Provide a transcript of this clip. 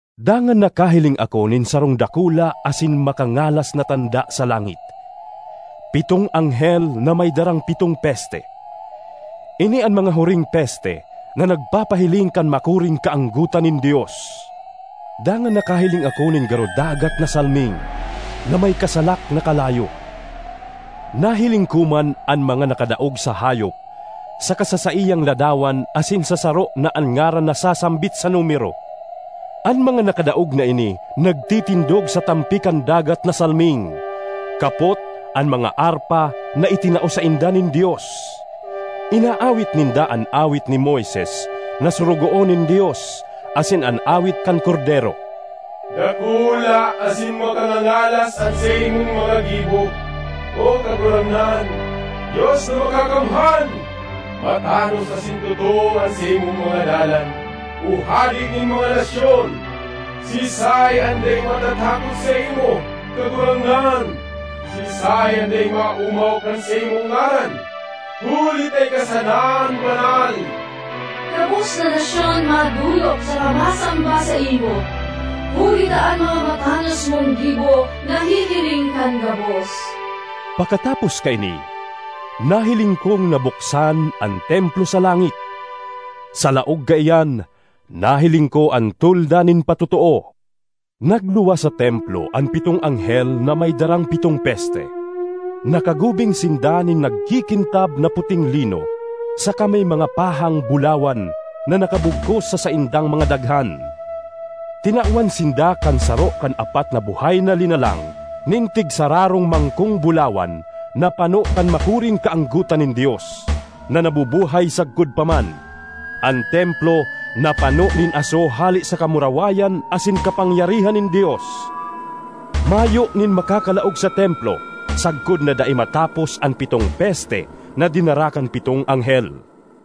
Dangan nakahiling ako nin sarong dakula asin makangalas na tanda sa langit: pitong anghel na may darang pitong peste. Ini an mga huring peste na nagpapahiling kan makuring kaanggotan nin Dios. Dangan nakahiling ako nin garo dagat na salming na may kasalak na kalayo. Nahiling ko man an mga nakadaog sa hayop saka sa saiyang ladawan asin sa saro na an ngaran nasasambit sa numero. An mga nakadaog na ini nagtitindog sa tampi kan dagat na salming, kapot an mga arpa na itinao sainda nin Dios. Inaawit ninda an awit ni Moises na sorogoon nin Dios, asin an awit kan Kordero: “Dakula asin makangangalas an saimong mga gibo, O Kagurangnan, Dios na Makakamhan! Matanos asin totoo an saimong mga dalan, O Hade nin mga nasyon! Siisay an dai matatakot saimo, Kagurangnan? Siisay an dai maomaw kan saimong ngaran? Huli ta ika sana an banal. Gabos na nasyon madolok saka masamba saimo, huli ta an mga matanos mong gibo nahihiling kan gabos.” Pakatapos kaini, nahiling kong nabuksan an templo sa langit; sa laog kaiyan nahiling ko an Tolda nin Patotoo. Nagluwas sa templo an pitong anghel na may darang pitong peste; nakagubing sinda nin nagkikintab na puting lino saka may mga pahang bulawan na nakabugkos sa saindang mga daghan. Tinawan sinda kan saro kan apat na buhay na linalang nin tigsararong mangkong bulawan na pano kan makuring kaanggotan nin Dios, na nabubuhay sagkod pa man. An templo napano nin aso hale sa kamurawayan asin kapangyarihan nin Dios; mayo nin makakalaog sa templo sagkod na dai matapos an pitong peste na dinara kan pitong anghel.